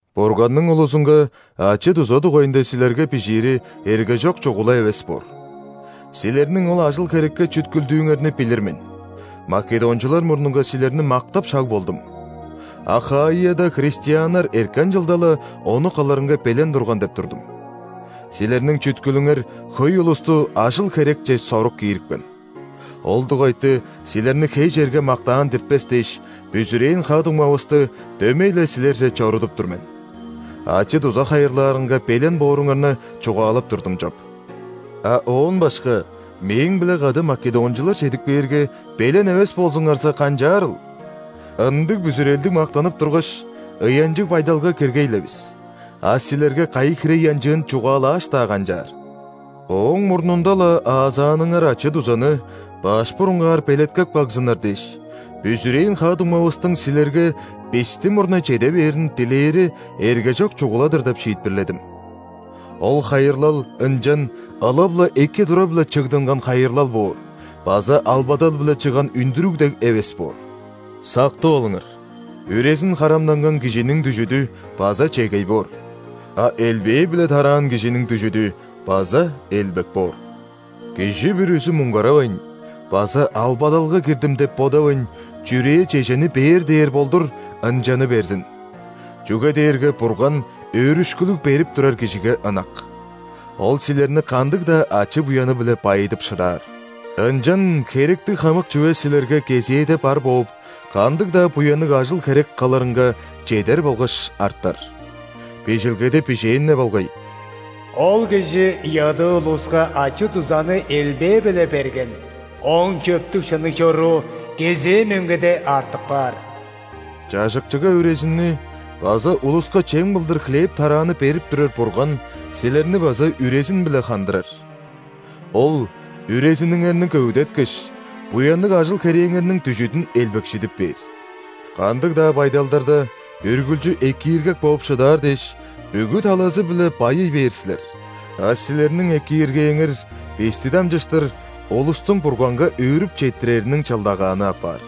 Бурганның улузунга ачы-дуза дугайында силерге бижиири эргежок чугула эвес боор. Силерниң ол ажыл-херекке чүткүлдүүңерни билир мен, македончулар мурнунга силерни мактап шаг болдум: Ахаияда христианнар эрткен чылда-ла ону кылырынга белен турган деп турдум. Силерниң чүткүлүңер хөй улусту ажыл-херекче сорук киирипкен. Ол дугайты силерни хей черге мактаан диртпес дээш, бүзүрээн ха-дуңмавысты дөмей-ле силерже чорудуп тур мен. Ачы-дуза хайырлаарынга белен бооруңарны чугаалап турдум чоп. А оон башка мээң-биле кады македончулар чедип кээрге, белен эвес болзуңарза, канчаарыл? Ындыг бүзүрелдиг мактанып тургаш, ыянчыг байдалга киргей-ле бис, а силерге кайы хире ыянчыын чугаалааш-даа канчаар! Ооң мурнунда-ла аазааныңар ачы-дузаны баш бурунгаар белеткеп кагзыннар дээш, бүзүрээн ха-дуңмавыстың силерге бисти мурнай чеде бээрин дилээри эргежок чугула-дыр деп шиитпирледим. Ол хайырлал ынчан ылап-ла эки тура-биле чыгдынган хайырлал боор база албадал-биле чыгган үндүрүг дег эвес боор. Сактып алыңар: үрезин харамнанган кижиниң дүжүдү база чегей боор, а элбээ-биле тараан кижиниң дүжүдү база элбек боор. Кижи бүрүзү, муңгаравайн база «Албадалга кирдим» деп бодавайн, чүрээ чежени бээр дээр болдур, ынчаны берзин. Чүге дээрге Бурган өөрүшкүлүг берип турар кижиге ынак. Ол силерни кандыг-даа ачы-буяны-биле байыдып шыдаар. Ынчан херектиг хамык чүве силерге кезээде бар бооп, кандыг-даа буянныг ажыл-херек кылырынга чедер болгаш артар. Бижилгеде бижээн-не болгай:«Ол кижи ядыы улуска ачы-дузаны элбээ-биле берген,ооң чөптүг-шынныг чоруу кезээ мөңгеде артып каар». Чажыкчыга үрезинни база улуска чем кылдыр хлеб-тарааны берип турар Бурган силерни база үрезин-биле хандырар. Ол үрезиниңерни көвүдеткеш, буянныг ажыл-херээңерниң дүжүдүн элбекшидип бээр. Кандыг-даа байдалдарда үргүлчү экииргек бооп шыдаар дээш, бүгү талазы-биле байый бээр силер, а силерниң экииргээңер бисти дамчыштыр улустуң Бурганга өөрүп четтирериниң чылдагааны апаар.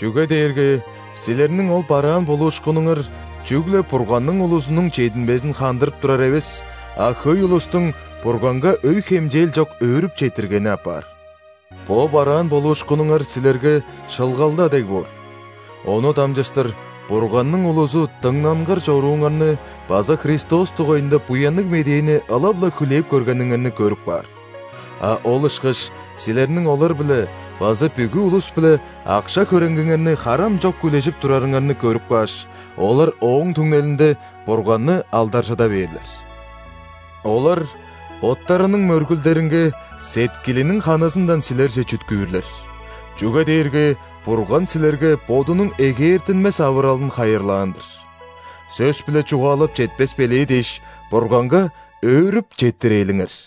Чүге дээрге силерниң ол бараан болуушкунуңар чүгле Бурганның улузунуң чединмезин хандырып турар эвес, а хөй улустуң Бурганга өй-хемчээл чок өөрүп четтиргени апаар. Бо бараан болуушкунуңар силерге шылгалда дег боор, ону дамчыштыр Бурганның улузу дыңнангыр чорууңарны база Христос дугайында Буянныг Медээни ылап-ла хүлээп көргениңерни көрүп каар. А ол ышкаш силерниң олар-биле база бүгү улус-биле акша-хөреңгиңерни харам чок үлежип турарыңарны көрүп кааш, олар ооң түңнелинде Бурганны алдаржыда бээрлер. Олар боттарының мөргүлдеринге сеткилиниң ханызындан силерже чүткүүрлер, чүге дээрге Бурган силерге Бодунуң эгээртинмес авыралын хайырлаан-дыр. Сөс-биле чугаалап четпес белээ дээш, Бурганга өөрүп четтирээлиңер!